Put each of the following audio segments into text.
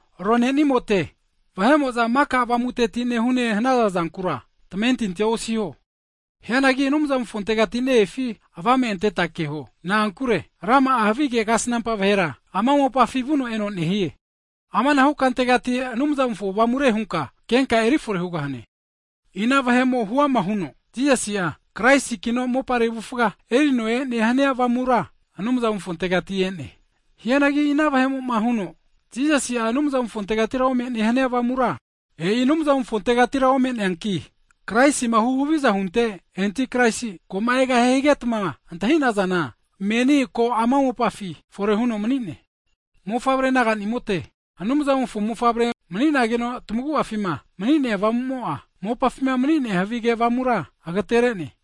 Ronenimote, vahe'mo'za maka avamuteti nehune hanaza zankura tamentinti osiho. Hianagi Anumzamofontegati ne-efi avame anteta keho. Na'ankure rama'a havige kasnampa vahera, ama mopafina vuno eno hu'ne. Amanahu kantegati Anumzamofo avamure hunka kenka eri fore hugahane. Ina vahe'mo huama huno Jisasi'a, Kraisikino mopare avufa erino e'ne hania avamura Anumzamofontegati e'ne. Hianagi vahe'mo'ma huama huno, Jisasi'a Anumzamofontegatira ome'ne hania avamura, e'i Anumzamofontegatira ome'neanki, Kraisima huhaviza hunte havige enti Kraisi, ko'ma egahie higetma antahi'nazana, menina ko ama mopafi fore huno mani'ne. Mofavre naganimote Anumzamofo mofavre mani'naze. Mani'nageno tamagu'afima mani'nea Avamu'mo'a, mopafima mani'nea havi avamura agatere'ne.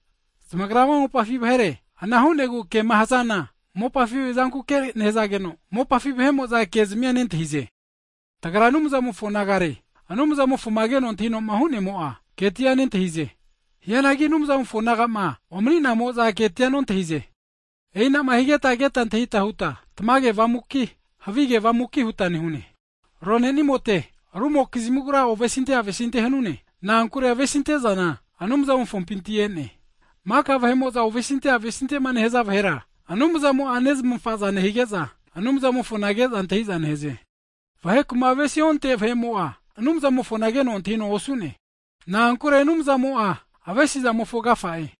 Zamagra ama mopafi vahere, ana hu'nagu kema hazana mopafi zankuke nehazageno, mopafi vahe'mo'za ke'zamia nentahize. Tagra Anumzamofo nagare, Anumzamofoma keno antahino hu'nemo'a, ketia nentahie. Hianagi Anumzamofo naga'ma omani'namo'za ketia nontahize. E'inama higeta keta antahita huta tamage Avamuki, havi avamuki huta nehune. Ronenimote, rumokizmigura ovesinte avesinte hanune, na'ankure avesinte'zana Anumzamofompinti e'ne. Maka vahe'mo'za ovesinte avesintema nehaza vahera, Anumzamo'a nezmafa'za nehige'za, Anumzamofona ke'za antahi'za nehaze. Vaheku'ma avesima onte vahe'mo'a, Anumzamofona keno antahino osu'ne. Na'ankure Anumzamo'a avesizamofo agafa'e.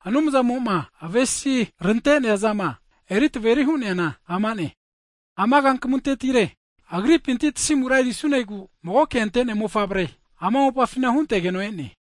Anumzamo'ma avesi rante'neazama eri taveri hu'neana amane, ana kankamuntetire, Agripinti tasimura erisunegu magoke ante'nea mofavre'a ama mopafina huntegeno e'ne.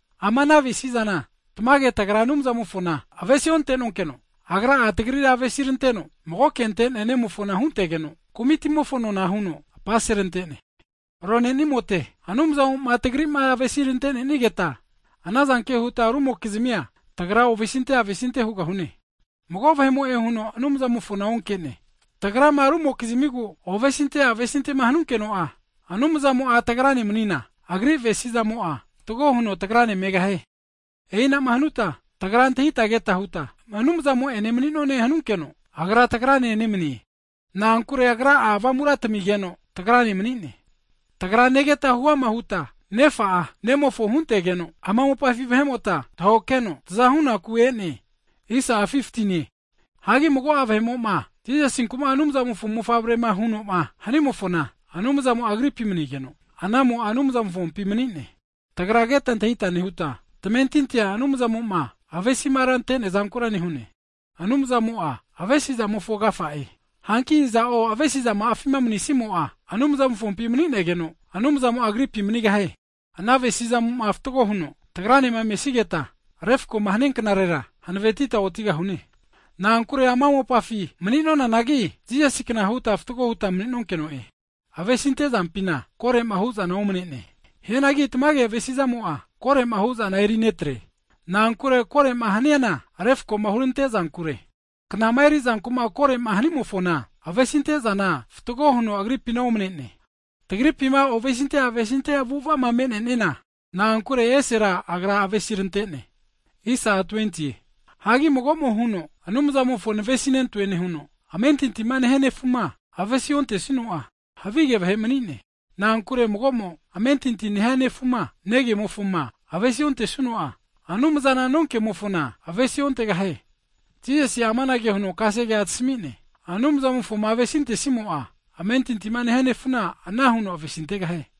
Ama ana avesi'zana, tamage tagra Anumzamofona avesi ontenonkeno, Agra'a tagrira avesi ranteno, magoke ante'nea Nemofona huntegeno, kumitimofona nona huno apaserante'ne. Ronenimote, Anumzamo'ma tagri'ma avesi rante'nenigeta, anazanke huta rumokizmia tagra ovesinte avesinte hugahune. Mago vahe'mo'e huno Anumzamofona onke'ne, tagrama rumokizmigu ovesinte avesintema hanunkeno'a, Anumzamo'a tagrane manina, Agri avesizamo'a fatgo huno tagrane megahie. E'ina'ma hanuta tagra antahita keta huta Anumzamo'ene mani'none hanunkeno, Agra tagrane nemanie. Na'ankure Agra'a Avamura tamigeno tagrane mani'ne. Tagra negeta huama huta Nefa'a, Nemofo huntegeno ama mopafi vahe'mota tahoke heno taza hunaku e'ne. Hagi mago'a vahe'mo'ma Jisasinku Anumzamofo mofavre huno'ma huama'ma hanimofona, Anumzamo'a Agripi manigeno, anamo'a Anumzamofompi mani'ne. Tagra keta antahita nehuta, tamentintia Anumzamo'ma avesima rante'nea'zankura nehune. Anumzamo'a avesi'zamofo agafa'e. Hanki iza'o avesizama'afima manisimo'a, Anumzamofompi maninigeno, Anumzamo'a agripi manigahie. Ana avesizamo'ma fatgo huno tagranema mesigeta, refko'ma hania knarera, hanavetita otigahune. Na'ankure ama mopafi mani'nonanagi, Jisasikna huta fatgo huta mani'nonkeno'e. Avesinte zampina koro'ma hu'zana omane'ne, hianagi tamage avesi'zamo'a, koroma hu'zana erinetre. Na'ankure koro'ma haniana refko'ma hurante'zankure. Knama eri'zanku'ma koro'ma hanimofona, avesinte'zana fatgo huno agripina omane'ne. Tagripima ovesinte avesinte avu'ava'ma me'neana, na'ankure Agra esera avesirante'ne. Hagi mago'mo huno, Anumzamofo navesinentoe nehuno, amentintima nehia nefuma avesi ontesuno'a, havige vahe mani'ne. Na'ankure mago'mo amentinti nehia nefuma negemofama avesi ontesuno'a, Anumzana nonkemofona avesi ontegahie. Jisasi'a amanage huno kasegea tami'ne, Anumzamofoma avesintesimo'a, amentinti nehia nefuna ana huno avesintegahie.